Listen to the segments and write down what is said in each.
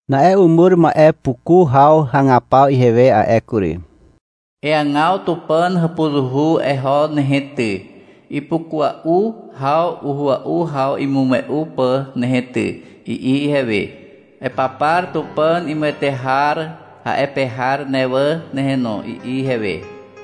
Na'e umur ma'e puku haw hagapaw ihewe a'e kury. — Eagaw Tupàn hàpuzuhu eho nehe ty, ipukua'u haw uhua'u haw imume'u pà nehe ty, i'i ihewe. — Epapar Tupàn imuwete har a'e pe har ne wà nehe no, i'i ihewe.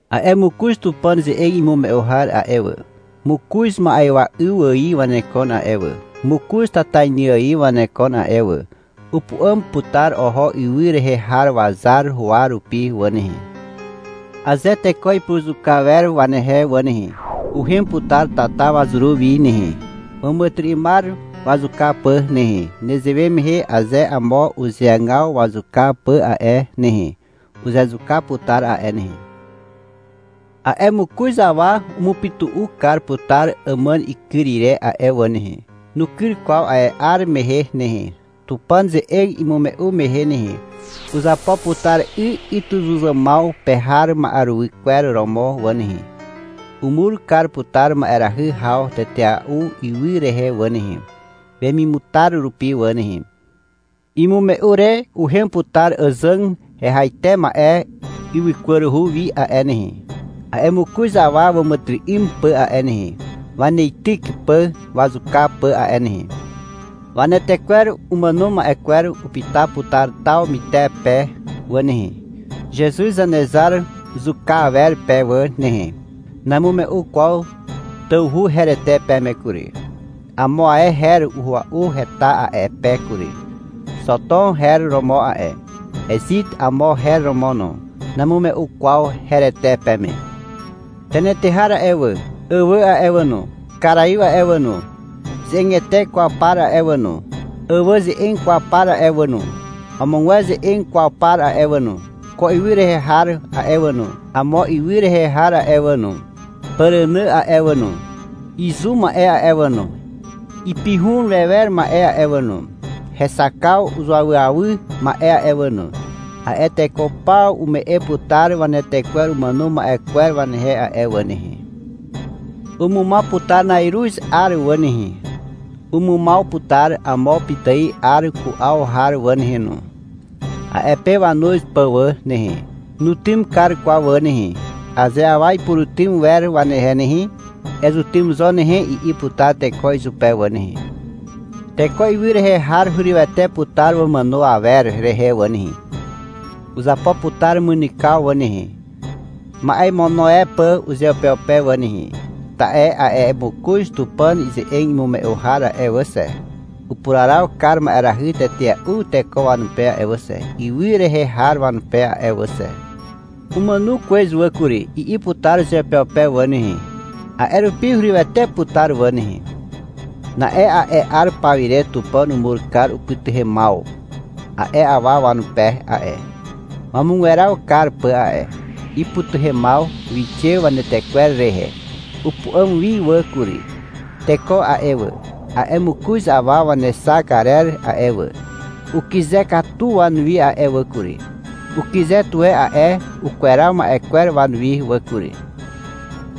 A'e mokoz Tupàn ze'eg imume'u har a'e wà, mokoz ma'ywa 'yw ài wanekon a'e wà, mokoz tatainy ài wanekon a'e wà. Upu'àm putar oho ywy rehe har wazar huwa rupi wà nehe. Aze teko ipuruzuka wer wanehe wà nehe, uhem putar tata wazuru wi nehe, wàmàtyry'ymar wazuka pà nehe. Nezewe mehe aze amo uzeagaw wazuka pà a'e nehe, uzezuka putar a'e nehe. A'e mokoz awa umupytu'u kar putar àmàn ikyr ire a'e wà nehe. Nukyr kwaw a'e 'ar mehe nehe, Tupàn ze'eg imume'u mehe nehe. Uzapo putar 'y ytyzuzàmaw pe har ma'eruwy kwer romo wà nehe. Umur kar putar ma'erahy haw tetea'u ywy rehe wà nehe, wemimutar rupi wà nehe. Imume'u re, uhem putar àzàg hehaite ma'e ywykwaruhu wi a'e nehe, a'e mokoz awa wàmàtyry'ym pà a'e nehe, waneityk pà wazuka pà a'e nehe. Wanetekwer umàno ma'e kwer upyta putar taw mytepe wà nehe, (Zezuz Zanezar zuka awer pe wà nehe). Namume'u kwaw tawhu herete peme kury. Amo ae her ua'u heta a'e pe kury. Xotom her romo a'e, Ezit amo her romo no. Namume'u kwaw herete peme. Tenetehar a'e wà, àwà a'e wà no, Karaiw a'e wà no, ze'egete kwaw par a'e wà no, àwà ze'eg kwaw par a'e wà no, amogwer ze'eg kwaw par a'e wà no, ko ywy rehe har a'e wà no, amo ywy rehe har a'e wà no, pàrànà a'e wà no, izu ma'e a'e wà no, ipihun wewer ma'e a'e wà no, hexakaw uzuawyawy ma'e a'e wà no, a'e teko paw ume'e putar wanetekwer umàno ma'e kwer wanehe a'e wà nehe. Umumaw putar na'iruz 'ar wà nehe, umumaw putar amo pitài 'ar ku'aw har wà nehe no, a'e pe wanuz pà wà nehe. Nutym kar kwaw wà nehe. Aze awa ipurutym wer wanehe nehe, — Ezutym zo nehe, i'i putar teko izupe wà nehe. Teko ywy rehe har hurywete putar wamàno awer rehe wà nehe. Uzapo putar mynykaw wà nehe, ma'e imono e pà uzeupeupe wà nehe, ta'e a'e mokoz Tupàn ze'eg imume'u har a'e wà xe, upuraraw kar ma'erahy tetea'u teko wanupe a'e wà xe, ywy rehe har wanupe a'e wà xe. Umàno kwez wà kury, i'i putar uzeupeupe wà nehe. A'e rupi hurywete putar wà nehe. Na'e a'e 'ar paw ire Tupàn umur kar upytuhemaw a'e awa wanupe a'e, wamugweraw kar pà a'e. Ipytuhemaw wixe wanetekwer rehe. Upu'àm wi wà kury. Teko a'e wà, a'e mokoz awa wanexak arer a'e wà, ukyze katu wanuwi a'e wà kury. Ukyze tuwe a'e ukweraw ma'e kwer wanuwi wà kury.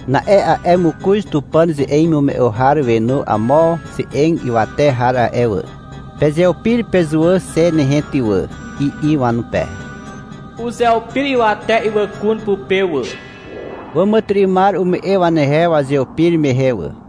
Na'e a'e mokoz Tupàn ze'eg imume'u har wenu amo ze'eg ywate har a'e wà. — Pezeupir pezuwà xe nehe ty wà, i'i wanupe. Uzeupir ywate ywàkun pupe wà. Wàmàtyry'ymar ume'e wanehe wazeupir mehe wà.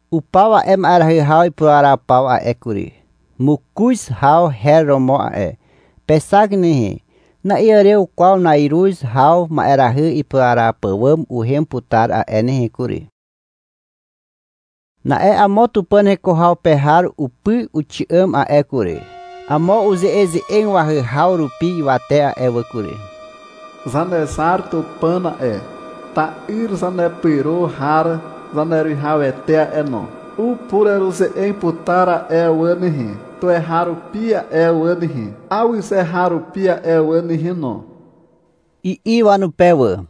Upaw a'e ma'erahy ipuraraw paw a'e kury. Mokoz haw her romo a'e. Pexak nehe. Na'iàrew kwaw na'iruz haw ma'erahy ipuraraw pàwàm uhem putar a'e nehe kury. Na'e amo Tupàn heko haw pe har upy uxi'àm a'e kury. Amo uze'eze'eg wahyhaw rupi ywate a'e wà kury. — Zanezar Tupàn a'e, ta'yr Zanepyro har Zaneruwihawete a'e no, upureruze'eg putar a'e wà nehe, tuweharupi a'e wà nehe, awyze har rupi a'e wà nehe no, i'i wanupe wà.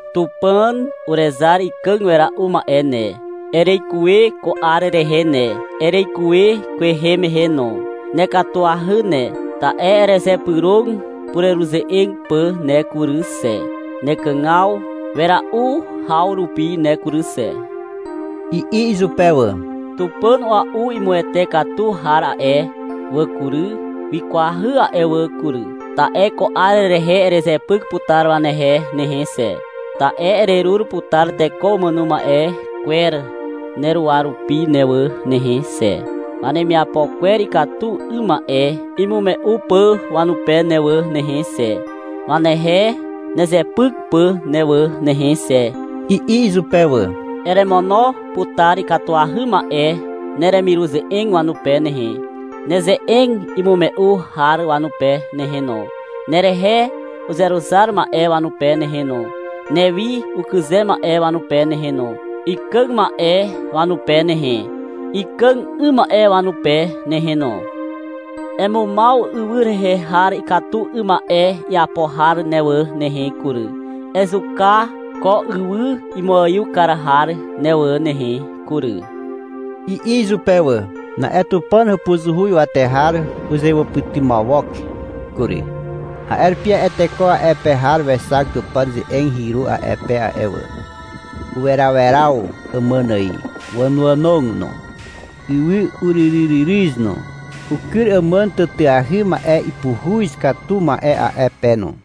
— Tupàn Urezar ikàg wera'u ma'e ne, ereikuwe ko 'ar rehe ne, ereikuwe kwehe mehe no. Nekatuahy ne, ta'e erezypyrog pureruze'eg pà ne kury xe, nekàg wera'u haw rupi ne kury xe, i'i izupe wà. — Tupàn ua'u imuwete katu har a'e wà kury, wikwahy a'e wà kury, ta'e ko 'ar rehe erezepyk putar wanehe nehe xe, ta'e ererur putar teko umàno ma'e kwer neruwa rupi ne wà nehe xe, wanemiapo kwer ikatu 'ym ma'e imume'u pà wanupe ne wà nehe xe, wanehe nezepyk pà ne wà nehe xe, i'i izupe wà. — Eremono putar ikatuahy ma'e neremiruze'eg wanupe nehe, neze'eg imume'u har wanupe nehe no, nerehe uzeruzar ma'e wanupe nehe no, newi ukyze ma'e wanupe nehe no, ikàg ma'e wanupe nehe, ikàg 'ym ma'e wanupe nehe no. Emumaw ywy rehe har ikatu 'ym ma'e iapo har ne wà nehe kury, ezuka ko ywy imuaiw kar har ne wà nehe kury, i'i izupe wà. Na'e Tupàn hàpuzuhu ywate har uzewàpytymawok kury. A'e rupi a'e teko a'e pe har wexak Tupàn ze'eg hyru a'e pe a'e wà. Uweraweraw àmàn ài, wànoànog no. Ywy uryryryryz no. Ukyr àmàn tàtàahy ma'e ipuhuz katu ma'e a'e pe no.